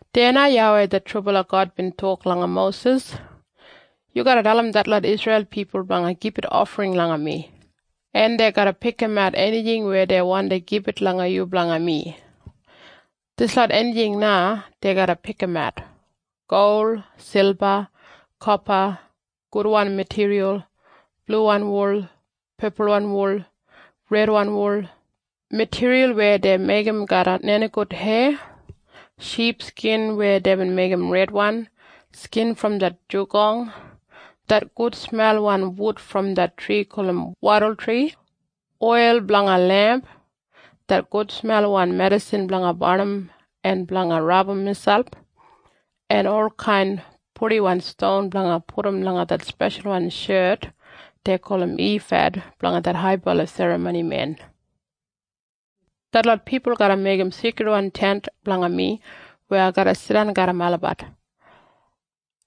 Deya na YAWEI det trubala God bin tok langa Mosis, “Yu garra dalim detlot Isreil pipul blanga gibit ofring langa mi, en dei garra pikimat enijing weya dei wandi gibit langa yu blanga mi. Dislot enijing na dei garra pikimat. Gol, silba, kopa, gudwan matiriyal, bluwan wul, pepulwan wul, redwan wul, matiriyal weya dei meigim garram nenigout heya, ship skin weya deibin meigim redwan, skin brom det nenigout, det gudsmelwan wud brom det tri gulum wadultri, oil blanga lemp, det gudsmelwan medisin blanga barnim en blanga rabum miselp, en olkain purdiwan ston blanga pudum langa det speshalwan shet dei gulum ifad blanga det haibala serramonimen. “Detlot pipul garra meigim Seikridwan Tent blanga mi weya ai garra jidan garram olabat.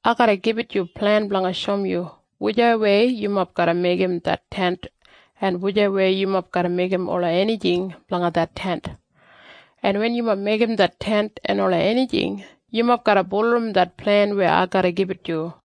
Ai garra gibit yu plen blanga shoum yu hau yumob garra meigim det Tent en hau yumob garra meigim ola enijing blanga det tent. En wen yumob meigim det tent en ola enijing, yumob garra bulurrum det plen weya ai garra gibit yu.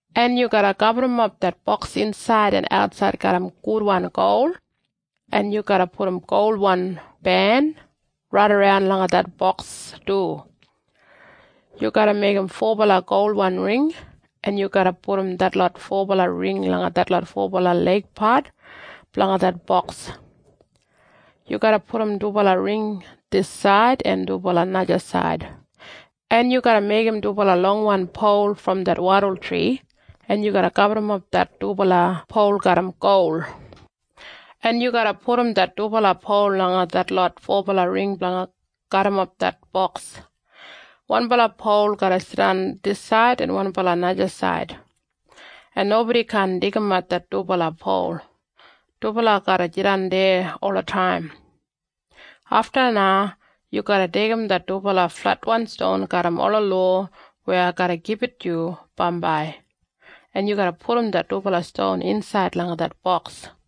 en yu garra gaburrumap det boks insaid en atsaid garram gudwan gol, en yu garra pudum golwan ben raidaran langa det boks du. Yu garra meigim fobala golwan ring, en yu garra pudum detlot fobala ring langa detlot fobala leigpat blanga det boks. Yu garra pudum dubala ring disaid en dubala najasaid, en yu garra meigim dubala longwan pol brom det wadultri, en yu garra gaburrumap det dubala pol garram gol, en yu garra pudum det dubala pol langa detlot fobala ring blanga garrimap det boks. Wanbala pol garra jidan disaid en wanbala najasaid, en nobodi kaan deigimat det dubala pol. Dubala garra jidan deya olataim. Afta na yu garra deigim det dubala fletwan ston garram ola lowa weya ai garra gibit yu bambai, en yu garra pudum det dubala ston insaid langa det boks.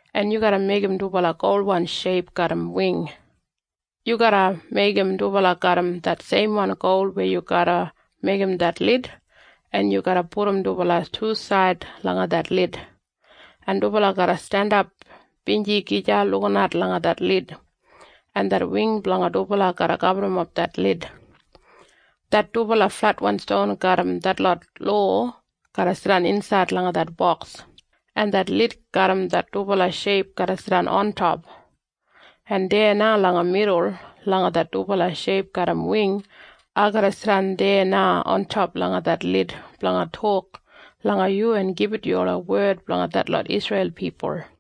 en yu garra meigim dubala golwan sheip garram wing. Yu garra meigim dubala garram det seimwan gol weya yu garra meigim det lid, en yu garra pudum dubala tusaid langa det lid, en dubala garra jandap feis gija lukinat langa det lid, en det wing blanga dubala garra gaburrumap det lid. Det dubala fletwan ston garram detlot lowa garra jidan insaid langa det boks, en det lid garram det dubala sheip garra jidan ontop. En deya na langa midul langa det dubala sheip garram wing, ai garra jidan deya na ontop langa det lid blanga tok langa yu en gibit yu ola wed blanga detlot Isreil pipul.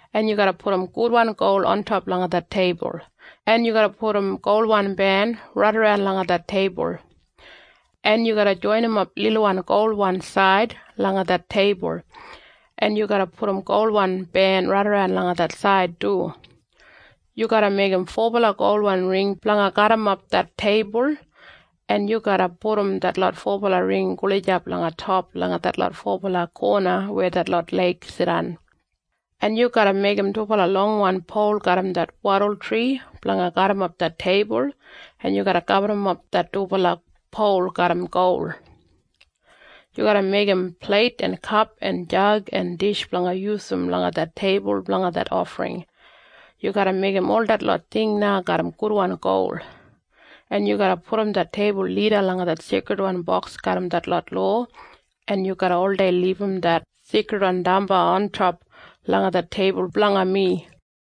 en yu garra pudum gudwan gol ontop langa det teibul, en yu garra pudum golwan ben raidaran langa det teibul, en yu garra joinimap lilwan golwan said langa det teibul, en yu garra pudum golwan ben raidaran langa det said du. Yu garra meigim fobala golwan ring blanga garrimap det teibul, en yu garra pudum detlot fobala ring gulijap langa top langa detlot fobala kona weya detlot leig jidan, en yu garra meigim dubala longwan pol garram det wadultri blanga garrimap det teibul, en yu garra gaburrumap det dubala pol garram gol. Yu garra meigim pleit en kap en jag en dish blanga yusum langa det teibul blanga det ofring. Yu garra meigim ol detlot ting na garram gudwan gol, en yu garra pudum det teibul lida langa det Seikridwan Boks garram detlot lowa, en yu garra oldei libum det seikridwan damba ontop langa det teibul blanga mi.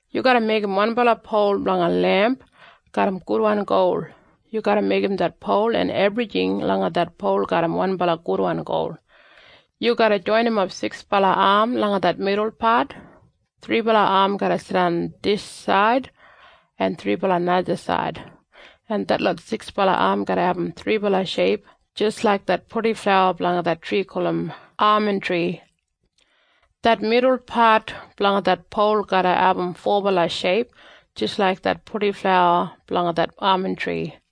“Yu garra meigim wanbala pol blanga lemp garram gudwan gol. Yu garra meigim det pol en ebrijing langa det pol garram wanbala gudwan gol. Yu garra joinimap siksbala am langa det midul pat. Thribala am garra jidan disaid en thribala najasaid, en detlot siksbala am garra abum thribala sheip jis laik det purdiflawa blanga det tri gulum amantri. Det midul pat blanga det pol garra abum fobala sheip jis laik det purdiflawa blanga det amantri,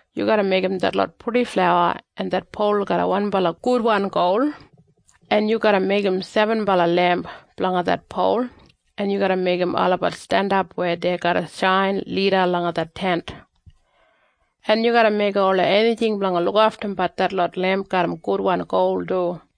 Yu garra meigim detlot purdiflawa en det pol garram wanbala gudwan gol, en yu garra meigim sebenbala lemp blanga det pol, en yu garra meigim olabat jandap weya dei garra shain lida langa det Tent. En yu garra meigim ola enijing blanga lukaftum detlot lemp garram gudwan gol du.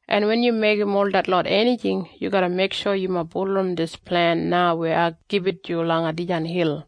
en wen yu meigim ol detlot enijing, yu garra meiksho yumob bulurrum dis plen na weya ai gibit yu langa dijan hil.”